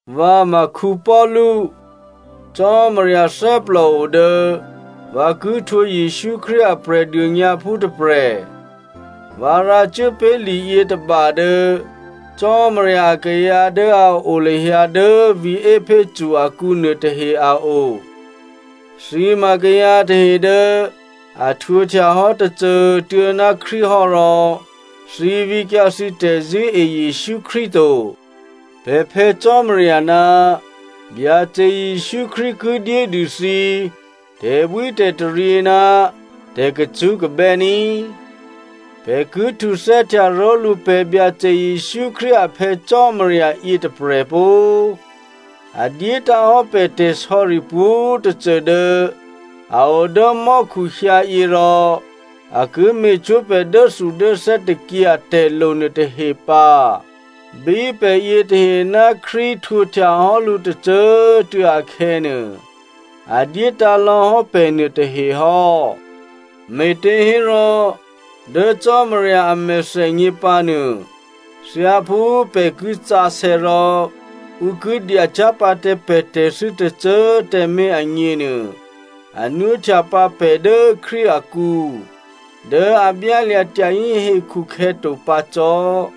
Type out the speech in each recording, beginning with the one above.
Vǎ ma Paulu. Cò́marya thè́plòo dố vǎ ki htwǒ Jesǔ Krístu a Prè̤dônyǎphú tôprè̤. Vǎ rǎcuốpé̤ liyětôba dố Cò́marya akayǎ dố a o lahyǎ dố vǐ̤ Epheso akǔ nuôtahe a o. Thǐ ma kayǎ tahe dố a htwǒhtya hò́ tôcô꤮ tuô̌ ná Krístu hò́ rò, thǐ vǐkyǎ thǐ tè̤zṳ̂́e Jesǔ Krístu to. Pè̤ Phè̌ Cò́marya ná Byacè Jesǔ Krístu ki dyédû thǐ tè̤bwítè̤taryě ná tè̤kacṳ́kabè́ ní꤮. Pè̤ ki htuthè́htya ró̤lǔ pè̤ Byacè Jesǔ Krístu a Phè̌ Cò́marya yětôprè̤ pó꤮. A dyétǎ̤hò́ pè̤ tè̤sò̌ri pwǒ̤꤮ tôcô dố a o dố mò́khu hyǎyě rò a ki me̤cwó̤ pè̤ dốthudốthè́ tôkyě atè̤lo nuôtahe pǎ. Bí pè̤ yětahe ná Krístu htwǒhtya hò́ lǔ tôcô꤮ tuô̌ akhè̌nuô, a dyétǎ̤ lò̌hò́ pè̤ nuôtahe hò́. Me̤těhérò, dố Cò́marya a mèthènyě pǎnuô, thyáphú pè̤ ki sǎsè̌ rò ǔ ki dyacyá̤ pǎ tǎ pè̤ tè̤thû́ tôcô꤮ tǎmé̤ agněnuô, a nwóhtyapǎ pè̤ dố Krístu akǔ, dố a byálya̤ tyahí hekhu khè̌to pǎ cò́.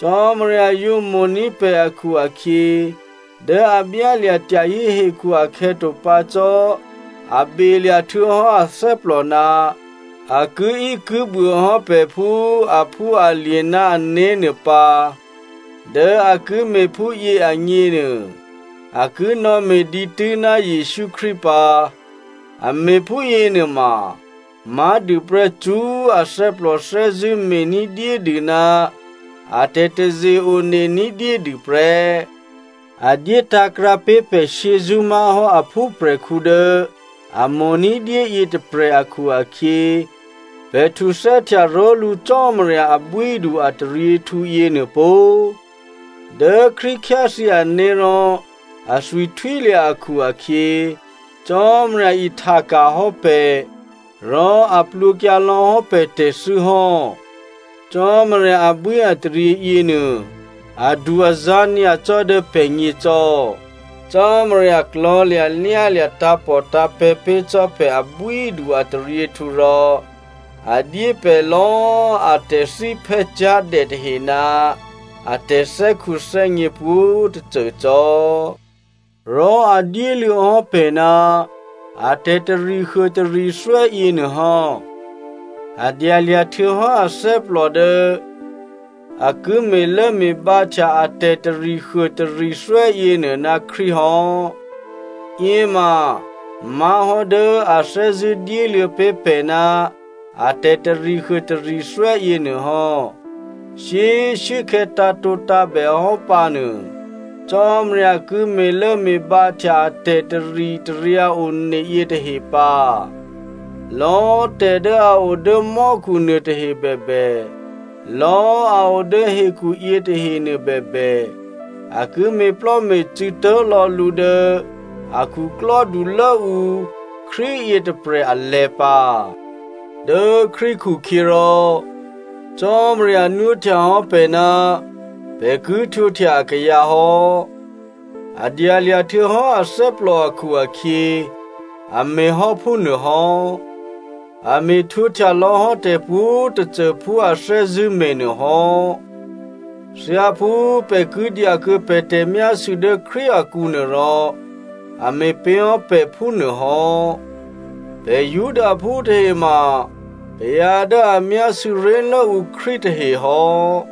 Cò́marya yǒ mo̤ní̤ pè̤ akhu-akhyě, dố꤮ a byálya̤ tyahí hekhu akhè̌to pǎ cò́ a belya̤ htuô̌hò́ athè́plò ná a kiíkibuô hò́ pè̤ phú a phúalye̤ ná ané̤nuô pǎ, dố a ki me̤ phúyě agněnuô, a ki nò̌me̤ dǐtû́ ná Jesǔ Krístu pǎ. A me̤ phúyěnuôma má̤dûprè́ cṳ́꤮ athè́plò thè́zṳ̂́ me̤ní̤dyédû ná a tè̤taze-one ní̤dyédû prè́. A dyétǎ̤krǎ pé̤ pè̤ shyězṳ́ má̤hò́ a phúprè̤khǔ dố a mo̤ ní̤dyé yětôprè̤ akhu-akhyě, pè̤ htuthè́htya ró̤lǔ Cò́marya abwídu-ataryěhtǔ yěnuô pó꤮. Dố Krístu khyáthyě ané̤ rò athwi htwílya̤ akhu-akhyě, Cò́marya ihtaka̤ hò́ pè̤, rò a plwǒkyǎ lò̌hò́ pè̤ tè̤thû́ hò́. Cò́marya abwíataryě yěnuô adu-azǎ̤ nyacò́ dố pè̤gně cò́. Cò́marya klò̤̌lya̤lyálya̤ tǎ̤pòtǎ̤pè̤̌ pé̤ cò́ pè̤ abwídu-ataryěhtǔ rò, a dyé pè̤ lò̌꤮ a tè̤thíphè́ cyá̤dè tahe ná a tè̤thè́khuthè́gně pwǒ̤꤮ tôcô cò́. Rò a dyéluô̌ hò́ pè̤ ná a tè̤tarihuô tarithwè́ yěnuôhò́. A dyalya̤ htuô̌hò́ athè́plò dố a ki me̤lốme̤bǎhtya a tè̤tarihuô tarithwè́ yěnuô ná Krístu hò́. Yěma má̤hò́ dố a thè́zṳ̂́ dyéluô̌ pé̤ pè̤ ná a tè̤tarihuô tarithwè́ yěnuôhò́. Shyé꤮ shuốkhè̌ tǎ̤tǒtǎ̤bè hò́ pǎnuô, Cò́marya ki me̤lốme̤bǎhtya a tè̤taritaryǎ one yětahe pǎ. Lò̌꤮ tè̤dố a o dố mò́khu nuôtahe bèbè, lò̌꤮ a o dố hekhu yětahe nuôbèbè, a ki me̤plò́me̤cû̌ tố̤lò̌ lǔ dố a khuklò́dulốǔ Krístu yětôprè̤ alè̤̌ pǎ. Dố Krístu khukhyěrò, Cò́marya nwóhtyahò́ pè̤ ná pè̤ ki htwǒhtya akayǎ hò́. A dyalya̤ htuô̌hò́ athè́plò akhu-akhyě, a me̤ hò́ phúnuô hò́. A me̤htwǒhtya lò̌hò́ tè̤pwǒ̤꤮ tôcô phú a thè́zṳ̂́ me̤nuô hò́. Thyáphú pè̤ ki dyakuô̌ pè̤ tè̤myásû̌ dố Krístu akǔnuô rò, a me̤ pé̤hò́ pè̤ phúnuôhò́. Pè̤ Judaphú tahe ma kayǎ dố a myásû̌ ré̤lốǔ Krístu tahehò́.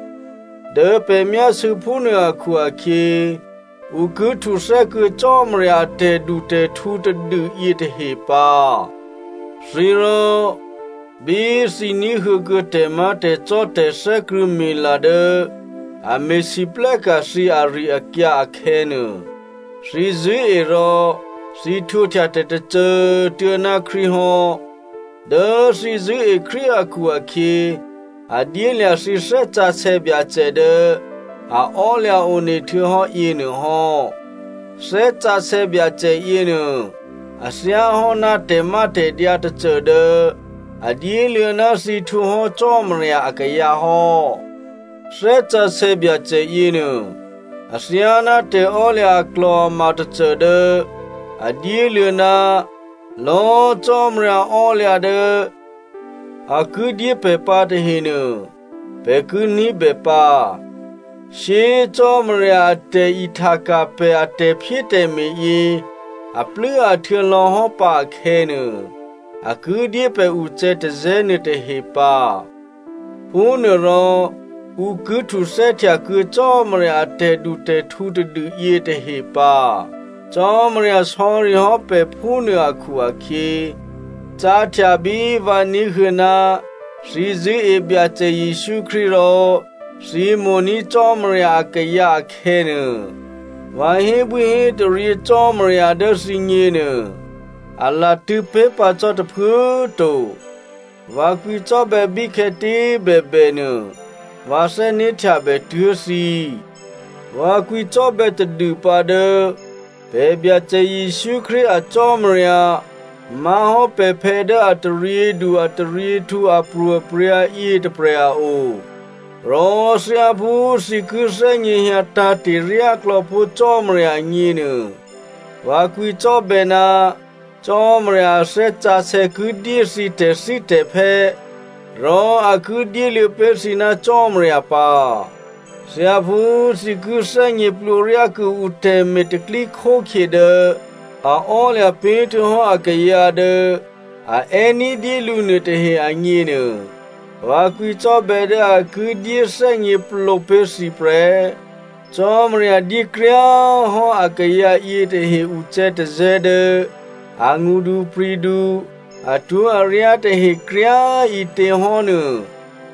Dố pè̤ myásû̌ phúnuô akhu-akhyě, ǔ ki htuthè́ kuô̌ Cò́marya a tè̤dutè̤htǔ tadû yětahe pǎ. Thǐ rò, bí thǐ ní̤huô̌ kuô̌ tè̤má̤tè̤cò́, tè̤thè́krṳ̂̌mila dố a me̤lwóhteka̤ thǐ ari-akyǎ akhè̌nuô, thǐ zṳ̂́e rò thǐ htwǒhtya tè̤tôcô꤮ tuô̌ ná Krístu hò́. Dố thǐ zṳ̂́e Krístu akhu-akhyě, a dyélya̤ thǐ Thè́ Sǎsè̌ Byacè dố a ò́lya̤ one htuô̌hò́ yěnuô hò́. Thè́ Sǎsè̌ Byacè yěnuô a thyáhò́ ná tè̤mátè̤dyǎ tôcô dố a dyéluô̌ ná thǐ htwǒhò́ Cò́marya akayǎ hò́. Thè́ Sǎsè̌ Byacè yěnuô athyáná tè̤ò́lya̤ aklò̤ama tôcô dố a dyéluô̌ ná lò̌꤮ Cò́marya ò́lya̤ dố a ki dyé pè̤ pǎ tahenuô, pè̤ ki ní̤bè pǎ. Shyé꤮ Cò́marya a tè̤ihtaka̤ pè̤ a tè̤phyétè̤me̤ yě aplû́ahtuô̌ lò̌hò́ pǎ akhè̌nuô, a ki dyé pè̤ ucè̌tazè̌ nuôtahe pǎ. Phúnuôrò ǔ ki htuthè́htya kuô̌ Cò́marya a tè̤dutè̤htǔ tadû yětahe pǎ. Cò́marya sò̌rihò́ pè̤ phúnuô akhu-akhyě, cáhtya bí vǎ ní̤huô̌ ná thǐ zṳ̂́e Byacè Jesǔ Krístu rò thǐ mo̤ní̤ Cò́marya akayǎ akhè̌nuô, vǎ hébwíhétaryě Cò́marya dố thǐgněnuô a latṳ̂̌pé̤pǎ cò́ tôphuố꤮ to. Vǎ kwǐcò́bè̌ bíkhè̌tě꤮ bèbènuô, vǎ thè́né̤htyabè tuố̤ thǐ. Vǎ kwǐcò́bè̌ tadûpǎ dố pè̤ Byacè Jesǔ Krístu a Cò́marya, má̤hò́ pè̤phè̌ dố ataryědu ataryěhtǔ apro̤aprya̤ yětôprè̤ a o. Rò thyáphú thǐ ki thè́gněhyǎ tǎ̤te̤ ryáklò̌pó̤ Cò́marya agněnuô, vǎ kwǐcò́bè̌ ná Cò́marya a Thè́ Sǎsè̌ ki dyé thǐ tè̤thítè̤phè́, rò a ki dyéluô̌ pé̤ thǐ ná Cò́marya pǎ. Thyáphú thǐ ki thè́gněplǒryá kuô̌ǔ tè̤me̤ tè̤pro̤tè̤prya̤ dố a ò́lya̤ pé̤htuô̌ hò́ akayǎ dố a è́ ní̤dyé lǔ nuôtahe agněnuô, vǎ kwǐcò́bè̌ dố a ki dyéthè́gněplǒ pé̤ thǐ prè́. Cò́marya dyé kryá꤮ hò́ akayǎ yětahe ucè̌tazè̌ dố angṳdupri̤du, atwó̤aryá tahe kryá꤮ ǐtěhò́nuô,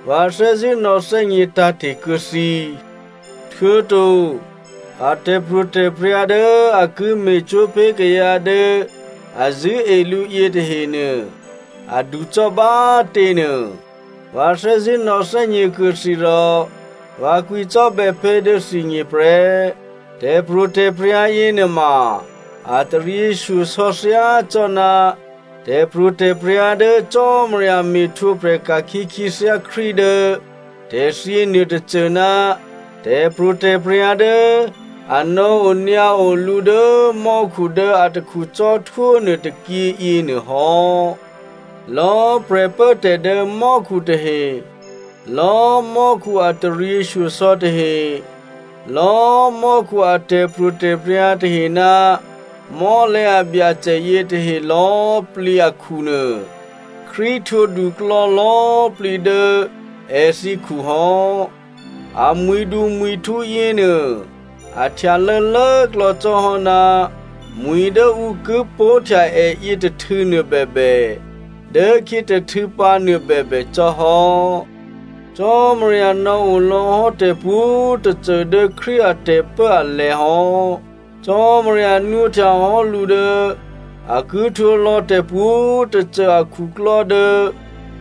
vǎ thè́zṳ̂́ nò̌thè́gně tǎ̤te̤ kuô̌ thǐ. Htuô̌to a tè̤pro̤tè̤prya̤ dố a ki me̤cwó̤ pé̤ kayǎ dố a zṳ̂́e lǔ yětahenuô, aducò́ bá꤮ těnuô, vǎ thè́zṳ̂́ nò̌thè́gně kuô̌ thǐ rò vǎ kwǐcò́bè̌ pé̤ dố thǐgně prè́. Tè̤pro̤tè̤prya̤ yěnuôma a taryěshyosò̌ thyácò́ná, tè̤pro̤tè̤prya̤ dố Cò́marya me̤htwǒprè̤ ka̤khyě khyěthyá Krístu dố tè̤thyě nuôtôcô ná tè̤pro̤tè̤prya̤ dố a nò̌onyǎo lǔ dố mò́khu dố atakhu cò́htwó nuôtôkyě yěnuôhò́. Lò̌꤮ prè̤pốtè̤ dố mò́khu tahe, lò̌꤮ mò́khu a taryěshyosò̌ tahe, lò̌꤮ mò́khu a tè̤pro̤tè̤prya̤ tahe ná mò́lè̤̌ abyacè yětahe lò̌꤮ plǐ akhunuô, Krístu htwǒduklò̌ lò̌꤮ plǐ dố èthǐkhu hò́. A mwi̤dumwi̤htǔ yěnuô a htyalô̌ lốklò̌ cò́hò́ ná mwi̤ dố ǔ ki pó̤htya è yětôhtû̌ nuôbèbè, dốkhyětôhtû̌ pǎ nuôbèbè cò́ hò́. Cò́marya nò̌o lò̌hò́ tè̤pwǒ̤꤮ tôcô dố Krístu a tè̤pốalè̤̌ hò́. Cò́marya nwóhtya hò́ lǔ dố a ki htwǒlò̌ tè̤pwǒ̤꤮ tôcô akhuklò́ dố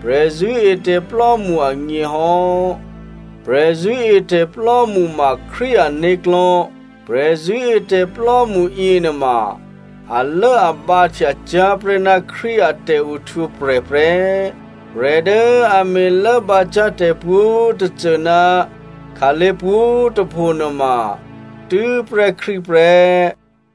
prè̤zṳ̂́etè̤plò́mṳ agně hò́. Prè̤zṳ̂́etè̤plò́mṳ ma Krístu ané̤klò̤́. Prè̤zṳ̂́etè̤plò́mṳ yěnuôma alốabǎhtya cyá̤ prè́ ná Krístu a tè̤ohtwǒprè̤ prè́. Prè̤ dố a me̤lốbǎcyá̤ tè̤pwǒ̤꤮ tôcô ná khǎlé̤ pwǒ̤꤮ tôpho nuôma tû́prè́ Krístu prè́.